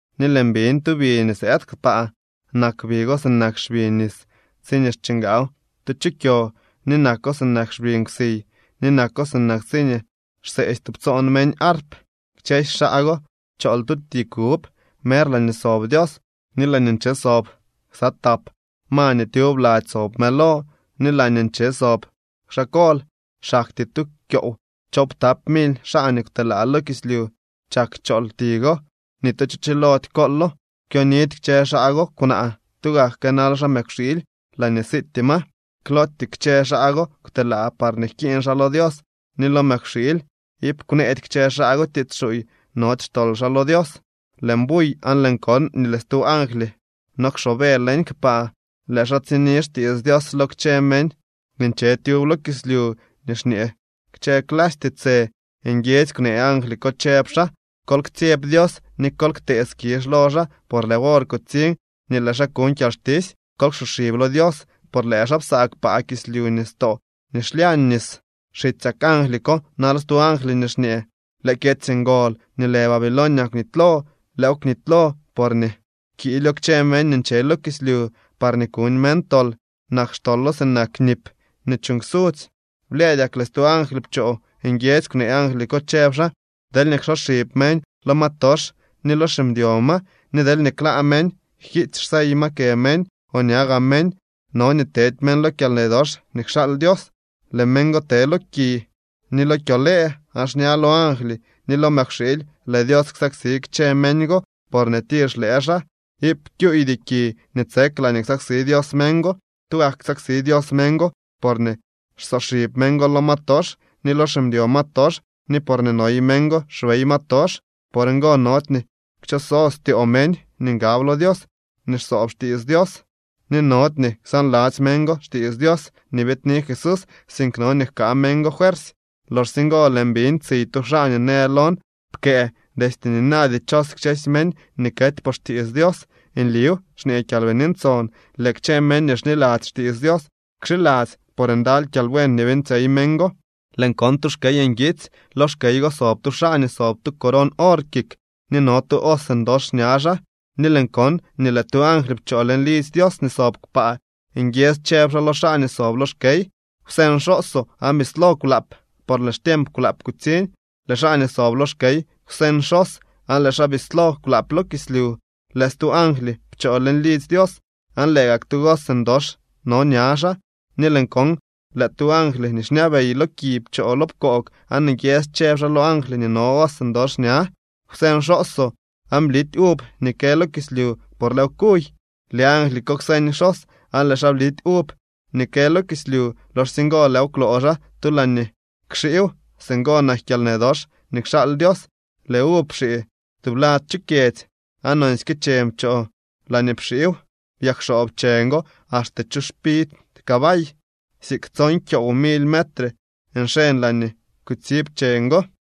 Ni lëën biñ tu bi nii sëëd kpaa. Nak bi go sinak xbi nis tsiñee xchingaaw tu chu kyo ni nako sinak xbi nkwsiy ni nako sinak tsiñee xseetsy tubtsoon meñ arp. Kchësy xaa go chool tu ti kub mer laañee sob Dios ni laañee nche sob ksa tap ma nii tyub lady sob mëlo ni laañee nche sob xaa kol. Xaktyee tu kyoow choowptapak mily xaa nii kwtelaa lo kislyu chak chool ti go. Ni tu cho chilody koolo. Kwyonidy kchë xaa go kwnaa, tugak kënal xaa mëkwxiily laañee siityee ma. Klootyee kchë xaa go kwtelaa parñee jkiiñ xaa lo Dios ni lo mëkwxiily. Iip kwneedy kchë xaa go tiits xuuy. Nody xtol xaa lo Dios. Lëën buy aan lëën kon nii lëë stu angly no kxoobe leñ kpaa. Lëë xaa tsini xtiits Dios lo kchë meñ nii nche tyub lo kislyu nii xñee kchë clasy tiitsë. Nguiedzy kwnee angly ko, chëb xaa: —Kol ktsyeb Dios ni kol ktee skizh lo xaa, por lëë wor kutsiñ nii lëë xaa kuñ kyalxtisy. Kol ksoxib lo Dios por lëë xaa psaa kpaa, kislyu, nistoo ni xlyañ nis. Xitsyak angly ko nal stu angly nii xñee: —Lëë kyedzy ngol nii lë Babilonia kwnitylo, lëëw kwnitylo porñee pkiilyo kchë meñ nii nche lo kislyu parñee kuñ meñ tol. Nak xtolo sinak nip nii chuuñ ksudzy. Blyëëdyak lëë stu angly pchoo, nguiedzy kwnee angly ko, chëb xaa: —Deelñee ksoxib meñ lo ma tox ni lo ximdyo ma, ni deelñee klaa meñ jkiitsy xsey ma kë meñ o ña gaa meñ, no nii tedy meñ lo kyalnë dox nii kxaal Dios. Lëë meñ go te lo ki ni lo kyolëë. Aan xña lo angly ni lo mëkwxiily lëë Dios ksaksi kchë meñ go porñee tir xlëë xaa. Iip kyuydy ki nii tsek laañee ksaksi Dios meñ go. Tugak ksaksi Dios meñ go porñee xsoxib meñ go lo ma tox ni lo ximdyo ma tox ni porñee noy meñ go xbey ma tox. Por ngo nody nii kchoso styoo meñ nii ngab lo Dios ni xsoob xtiits Dios, ni nody nii ksaanladzy meñ go xtiits Dios nii biidni Jesús, sink no nii jkaa meñ go fuersy. Loxsye ngo lëën biñ tsiy tu xaa nii në lon: —Pkëë: “Destye nina dichos kchë meñ nii kety por xtiits Dios.” “Nliw —xñee Kyalbini Ntson—, lëë kchë meñ nii xniladzy xtiits Dios kxiladzy, por ndaly kyalbuen nii beeñtsyey meñ go.” Lëën kon tu xkey nguitsy. Lo xkey go sob tu xaa nii sob tu coron or kik ni no tu hoz ndox ña xaa. Ni lëën kon nii lëë tu angly pchoo leñ lidzy Dios nii sob kpaa, nguiedzy chëb xaa lo xaa nii sob lo xkey: —Kwseeñ xhoozoo aan bislo kwlaap, por lëë xtiemp kwlaap kutsiñ. Lëë xaa nii sob lo xkey kwseñ xhoz aan lëë xaa bislo kwlaap lo kislyu. Lëë stu angly pchoo leñ lidzy Dios, aan lëë gak tu hoz ndox no ña xaa. Ni lëën kon lëë tu angly nii xñabey lo ki pchoo lo pkoog aan nguiedzy chëb xaa lo angly nii no hoz ndox ña: —Kwseñ xhoozoo aan blity uv nii kë lo kislyu por lëëw kuy. Lëë angly ko kwseñ xhoz aan lëë xaa blity uv nii kë lo kislyu. Loxsye ngo lëëw kwloo xaa tu laañee kxiiw. Singo nak kyalnë dox nii kxaal Dios. Lëë uv pxii tublad chu kyedzy, aan nonsyke cheñ pchoo laañee pxiiw, byakxoob cheñ go axte chu xpid cabay, siik tson kyoow mily metre nxeñ laañee kutsib cheñ go.